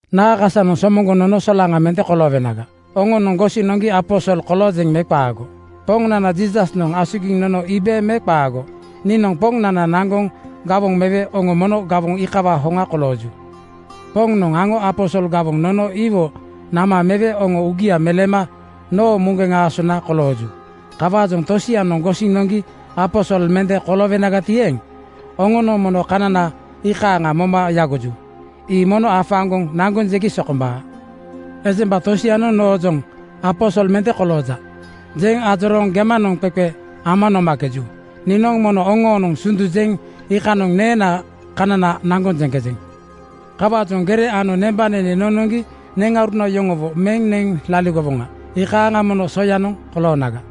Naa kasanoŋ somoŋgoŋ nono solaŋa mende koloowenaga? Oŋonoŋ gosiŋ noŋgi aposol koloojeŋ me qaago? Poŋnana Jiisasnoŋ asugiŋ nono iibe me qaago? Niinoŋ Pombaanoŋ naŋgoŋ gawoŋ mewe oŋo mono gawoŋ iikawaa hoŋa kolooju. Poŋnoŋ aŋo aposol gawoŋ nono iwo nama mewe oŋo uugia meleema noo muŋgeŋ aasona kolooju. Kawaajoŋ tosianoŋ gosiŋ noŋgi aposol mende koloowenagati eeŋ, oŋonoŋ mono kanana iikaaŋa moma yagoju. Ii mono afaaŋgoŋ naŋgoŋ jegi sokombaa. Ejemba tosianoŋ noojoŋ “Aposol mende kolooja,” jeŋ ajorooŋ gemanoŋ qeqe ama nomakejuto, niinoŋ mono oŋoonoŋ sundu jeŋ iikanoŋ neenaa kanana naŋgoŋ jeŋkejeŋ. Kawaajoŋ gere ano nembanene nonoŋgi neŋauruna yoŋowo meŋ neŋ laligowonaga, iikanoŋ mono soyanoŋ koloonaga.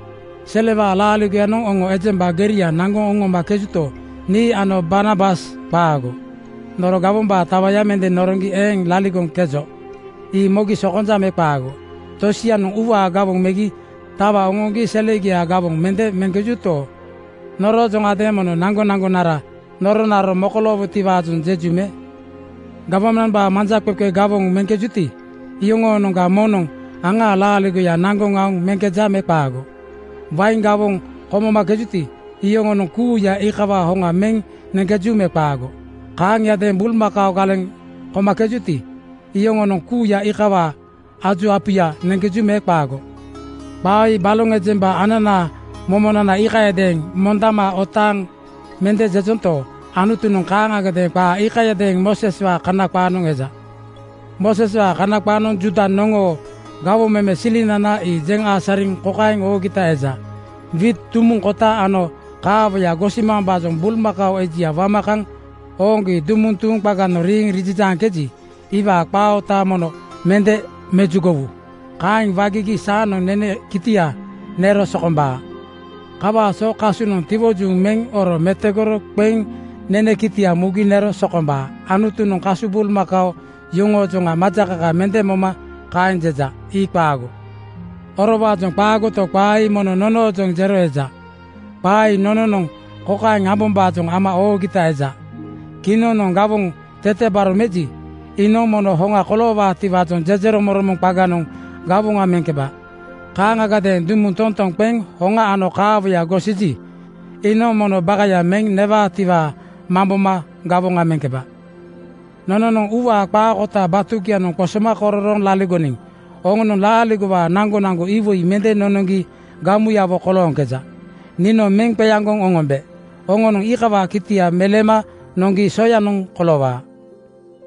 Selewaa laaligoyanoŋ oŋo ejemba geria naŋgoŋ oŋomakejuto, nii ano Barnabas qaago. Noro gawombaa tawaya mende noroŋgi eeŋ laligoŋkejo. Ii mogi sokonja me qaago? Tosianoŋ uuwaa gawoŋ megi tawa oŋoŋgi selegiaa gawoŋ mende meŋkejuto, noroojoŋgadeeŋ mono naŋgonaŋgonara noronaro mokoloowotiwaajoŋ jeju me? Gawmambaa manjaqeqe gawoŋ meŋkejuti, yoŋoonoŋga moŋnoŋ aŋaa laaligoya naŋgoŋ aoŋ meŋkeja me qaago? Wain gawoŋ komomakejuti, yoŋonoŋ kuuya iikawaa hoŋa meŋ neŋkeju me qaago? Kaaŋiadeeŋ bulmakao galeŋ komakejuti, yoŋonoŋ kuuya iikawaa aju apuya neŋkeju me qaago? Qaa ii baloŋ ejemba ananaa momonana iikayadeeŋ mondama otaaŋ mende jejento, Anutunoŋ kaaŋagadeeŋ qaa iikayadeeŋ Mooseswaa Kana qaanoŋ jeja. Mooseswaa Kana qaanoŋ Juuda noŋoo gawoŋ meme silinana ii jeŋ asariŋ kokaeŋ oogita eja, “Wiit dumuŋ kota ano kaawoya gosiwombaajoŋ bulmakao ejia wama kaŋ ooŋgi dumuŋ tuuŋ qaganoŋ riiŋ rijijaaŋkeji, iwaa qaa oota mono mende mejugowu. Kaeŋ wagigi saanoŋ nene kitia nero sokombaa.” Kawaa so kasunoŋ tiwojuŋ meŋ oro metogoro qeŋ nene kitia mugi nero sokombaa. Anutunoŋ kasu bulmakao yoŋoojoŋa majakaka mende moma kaeŋ jeja. Ii qaago. Orowaajoŋ qaagoto, qaa ii mono nonoojoŋ jero eja. Qaa ii nononoŋ kokaeŋ ambombaajoŋ ama oogita eja: Kinoŋnoŋ gawoŋ tetebaro meji, iinoŋ mono hoŋa koloowaatiwaajoŋ jejeromoŋromoŋ qaganoŋ gawoŋa meŋkeba. Kaaŋagadeeŋ dumuŋ toŋtonoŋ qeŋ hoŋa ano kaawoya gosiji, iinoŋ mono bakaya meŋ newaatiwaa mamboma gawoŋa meŋkeba. Nononoŋ uuwaa qaa kota batugianoŋ qosoma kororooŋ laligoniŋ oŋonoŋ laaaligowaa naŋgonaŋgo iwoi mende nonoŋgi gamuyawo kolooŋkeja. Niinoŋ meŋ qeaŋgoŋ oŋombe oŋonoŋ iikawaa kitia meleema noŋgi soyanoŋ koloowaa.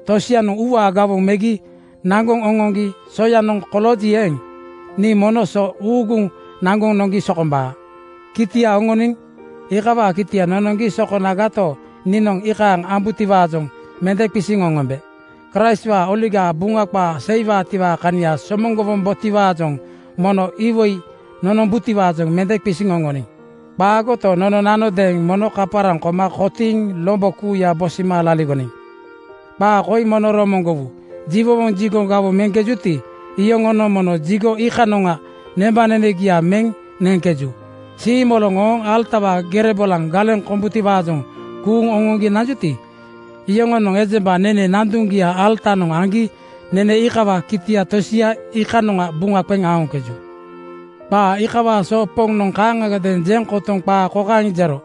Tosianoŋ batugianoŋ uuwaa gawoŋ megi naŋgoŋ oŋoŋgi soyanoŋ kolooji eeŋ, nii mono so ii uuguŋ naŋgoŋ noŋgi sokombaa. Kitia oŋoniŋ iikawaa kitia nonoŋgi so konagato, niinoŋ iikaaŋ ambutiwaajoŋ mende qisiŋ oŋombe. Kraistwaa Oligaa Buŋa qaa seiwaatiwaa kania somoŋgowombotiwaajoŋ mono iwoi nonombutiwaajoŋ mende qisiŋ oŋoniŋ. Qaagoto, nononanodeeŋ mono kaparaŋ koma kotiiŋ lombo kuuya bosima laligoniŋ. Qaa koi mono romoŋgowu: Jiwowoŋ jigonoŋ gawoŋ meŋkejuti, iyoŋonoŋ mono jigo iikanoŋa nembanenegia meŋ neŋkeju. Siimoloŋ ooŋ alatawaa gere bolaŋa galeŋ kombutiwaajoŋ kuuŋ oŋoŋgi nanjuti, iyoŋonoŋ ejemba nene nanduŋgia alatanoŋ aŋgi nene iikawaa kitia tosia ii iikanoŋa buŋa qeŋ aoŋkeju. Qaa iikawaa so Poŋnoŋ kaaŋagadeeŋ jeŋ kotoŋ qaa kokaeŋ jero,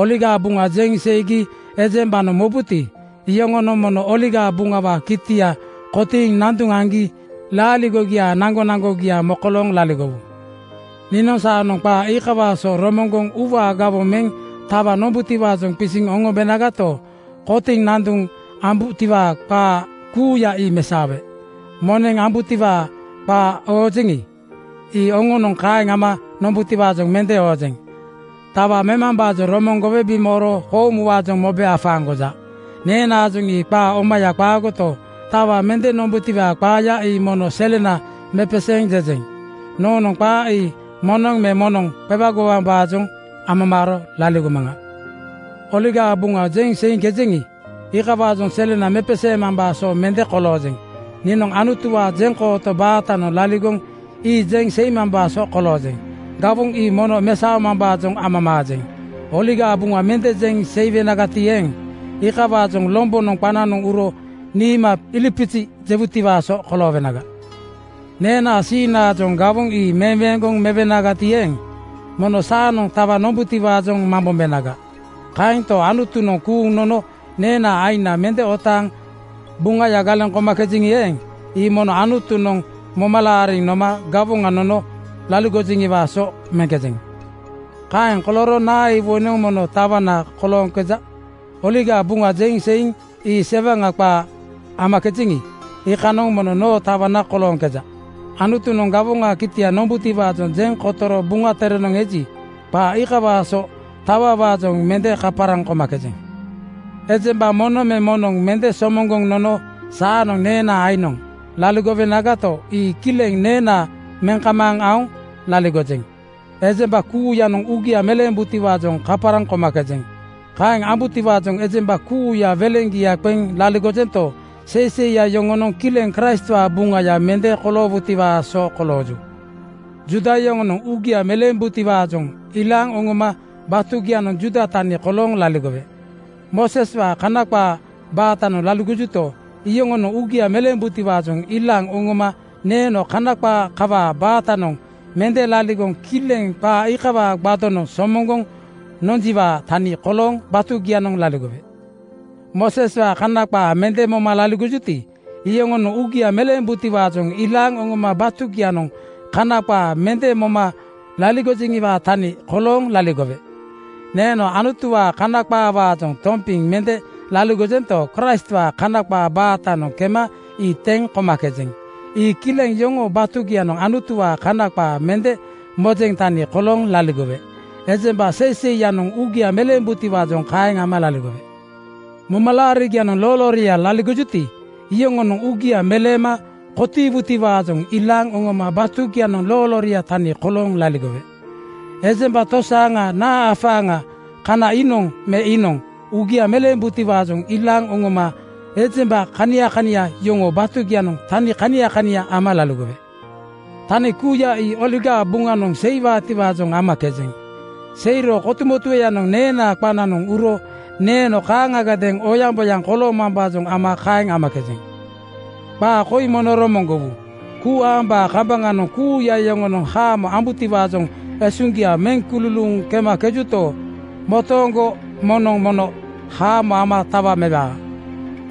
“Oligaa Buŋa jeŋ seigi ejembanoŋ mobuti, iyoŋonoŋ mono Oligaa Buŋawaa kitia kotiŋ nanduŋ aŋgi laaligogiaa naŋgonaŋgogia mokolooŋ laligowu.” Niinoŋ saanoŋ qaa iikawaa so romoŋgoŋ uuwaa gawoŋ meŋ tawa nombutiwaajoŋ qisiŋ oŋombenagato, kotiŋ nanduŋ ambutiwaa qaa kuuya ii mesaowe. Moneŋ ambutiwaa qaa oojeŋi, ii oŋonoŋ kaeŋ ama nombutiwaajoŋ mende oojeŋ. Tawa memambaajoŋ romoŋgowe bimooro koomuwaajoŋ mobe afaaŋgoja. Neenaajoŋ ii qaa omaya qaagoto, tawa mende nombutiwaa qaaya ii mono selena mepeseeŋ jejeŋ. Noonoŋ qaa ii moŋnoŋ me moŋnoŋ qewagomambaajoŋ amamaaro laligomaŋa. Oligaa Buŋa jeŋ seiŋkejeŋi, iikawaajoŋ selena mepeseemambaa so mende koloojeŋ. Niinoŋ Anutuwaa jeŋkooto baatanoŋ laligoŋ ii jeŋ seimambaa so koloojeŋ. Gawoŋ ii mono mesaomambaajoŋ amamaajeŋ. Oligaa Buŋa mende jeŋ seiwenagati eeŋ, iikawaajoŋ lombonoŋ qananoŋ uro niima ilipizi jewutiwaa so koloowenaga. Neenaa siiŋnaajoŋ gawoŋ ii meweeŋgoŋ mewenagati eeŋ, mono saanoŋ tawa nombutiwaajoŋ mambombenaga. Kaento, Anutunoŋ kuuŋ nono neenaa aiŋna mende otaaŋ Buŋaya galeŋ komakejeŋi eeŋ, ii mono Anutunoŋ moma laariŋ noma gawoŋa nono laligojeŋiwaa so meŋkejeŋ. Kaeŋ kolooro naa iwoinoŋ mono tawana kolooŋkeja? Oligaa Buŋa jeŋ seiŋ ii sewaŋa qaa amakejeŋi, iikanoŋ mono noo tawana kolooŋkeja. Anutunoŋ gawoŋaa kitia nombutiwaajoŋ jeŋ kotoro Buŋa Terenoŋ eji, qaa iikawaa so tawawaajoŋ mende kaparaŋ komakejeŋ. Ejemba moŋnoŋ me moŋnoŋ mende somoŋgoŋ nono saanoŋ neenaa aiŋnoŋ laligowenagato, ii kileŋ neena meŋ kamaaŋ aoŋ laligojeŋ. Ejemba kuuyanoŋ uugia meleembutiwaajoŋ kaparaŋ komakejeŋ. Kaeŋ ambutiwaajoŋ ejemba kuuya weleŋgia qeŋ laligojento, seiseiya yoŋonoŋ kileŋ Kraistwaa buŋaya mende koloowutiwaa so kolooju. Juuda yoŋonoŋ uugia meleembutiwaajoŋ ilaaŋ oŋoma batugianoŋ Juuda tani kolooŋ laligowe. Mooseswaa Kana qaa baatanoŋ laligojuti, iyoŋonoŋ uugia meleembutiwaajoŋ ilaaŋ oŋoma neeno Kana qaa kawaa baatanoŋ mende laligoŋ kileŋ qaa iikawaa gbadonoŋ somoŋgoŋ nonjiwaa tani kolooŋ batugianoŋ laligowe. Mooseswaa Kana qaa mende moma laligojuti, iyoŋonoŋ uugia meleembutiwaajoŋ ilaaŋ oŋoma batugianoŋ Kana qaa mende moma laligojeŋiwaa tani kolooŋ laligowe. Neeno Anutuwaa Kana qaawaajoŋ tompiŋ mende laligojento, Kraistwaa Kana qaa baatanoŋ kema ii teŋ komakejeŋ. Ii kileŋ yoŋoo batugianoŋ Anutuwaa Kana qaa mende mojeŋ tani kolooŋ laligowe. Ejemba seiseiyanoŋ uugia meleembutiwaajoŋ kaeŋ ama laligowe. Momalaarigianoŋ loolooria laligojuti, iyoŋonoŋ uugia meleema kotiiwutiwaajoŋ ilaaŋ oŋoma batugianoŋ loolooria tani kolooŋ laligowe. Ejemba tosaaŋa naa afaaŋaga kana iinoŋ me iinoŋ uugia meleembutiwaajoŋ ilaaŋ oŋoma ejemba kania kania yoŋoo batugianoŋ tani kania kania ama laligowe. Tani kuuya ii Oligaa Buŋanoŋ seiwaatiwaajoŋ amakejeŋ. Seiro kotumotueyanoŋ neenaa qananoŋ uro neeno kaaŋagadeeŋ oyaŋboyaŋ koloomambaajoŋ ama kaeŋ amakejeŋ. Qaa koi mono romoŋgowu: Kuu aambaa kambaŋanoŋ kuuya yoŋonoŋ haamo ambutiwaajoŋ esuŋgia meŋ kululuuŋ kemakejuto, motooŋgo moŋnoŋ mono haamo ama tawa mewaa.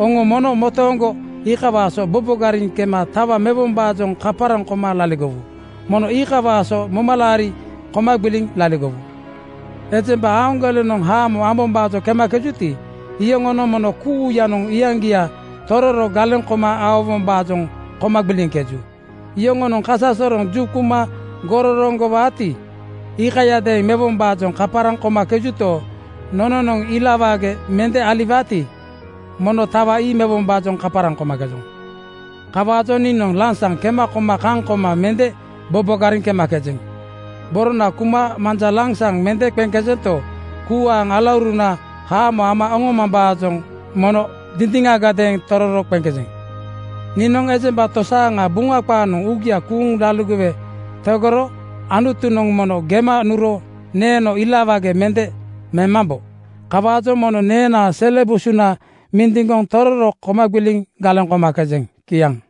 Oŋo mono motooŋgo iikawaa so bobogariŋ kema tawa mewombaajoŋ kaparaŋ koma laligowu. Mono iikawaa so momalaari koma gbiliŋ laligowu. Ejemba aaŋgolenoŋ haamo ambombaajoŋ kemakejuti, iyoŋonoŋ mono kuuyanoŋ iyaŋgia tororo galeŋ koma aowombaajoŋ koma gbiliŋkeju. Yoŋonoŋ kasasoroŋ juquma gororoŋgowaati, iikayadeeŋ mewombaajoŋ kaparaŋ komakejuto, nononoŋ ila wage mende aliwaati, mono tawa ii mewombaajoŋ kaparaŋ komakejoŋ. Kawaajoŋ niinoŋ lansaŋ kema koma kaŋ koma mende bobogariŋ kemakejeŋ. Borona kuma manja lansaŋ mende qeŋkejento, kuu aaŋ alauruna haamo ama oŋomambaajoŋ mono dindiŋagadeeŋ tororo qeŋkejeŋ. Niinoŋ ejemba tosaaŋa Buŋa qaanoŋ uugia kuuŋ laligowe tegoro Anutunoŋ mono gema nuro neeno ilawage mende memambo. Kawaajoŋ mono neenaa sele busuna mindiŋgoŋ tororo koma gbiliŋ galeŋ komakejeŋ. Kiaŋ.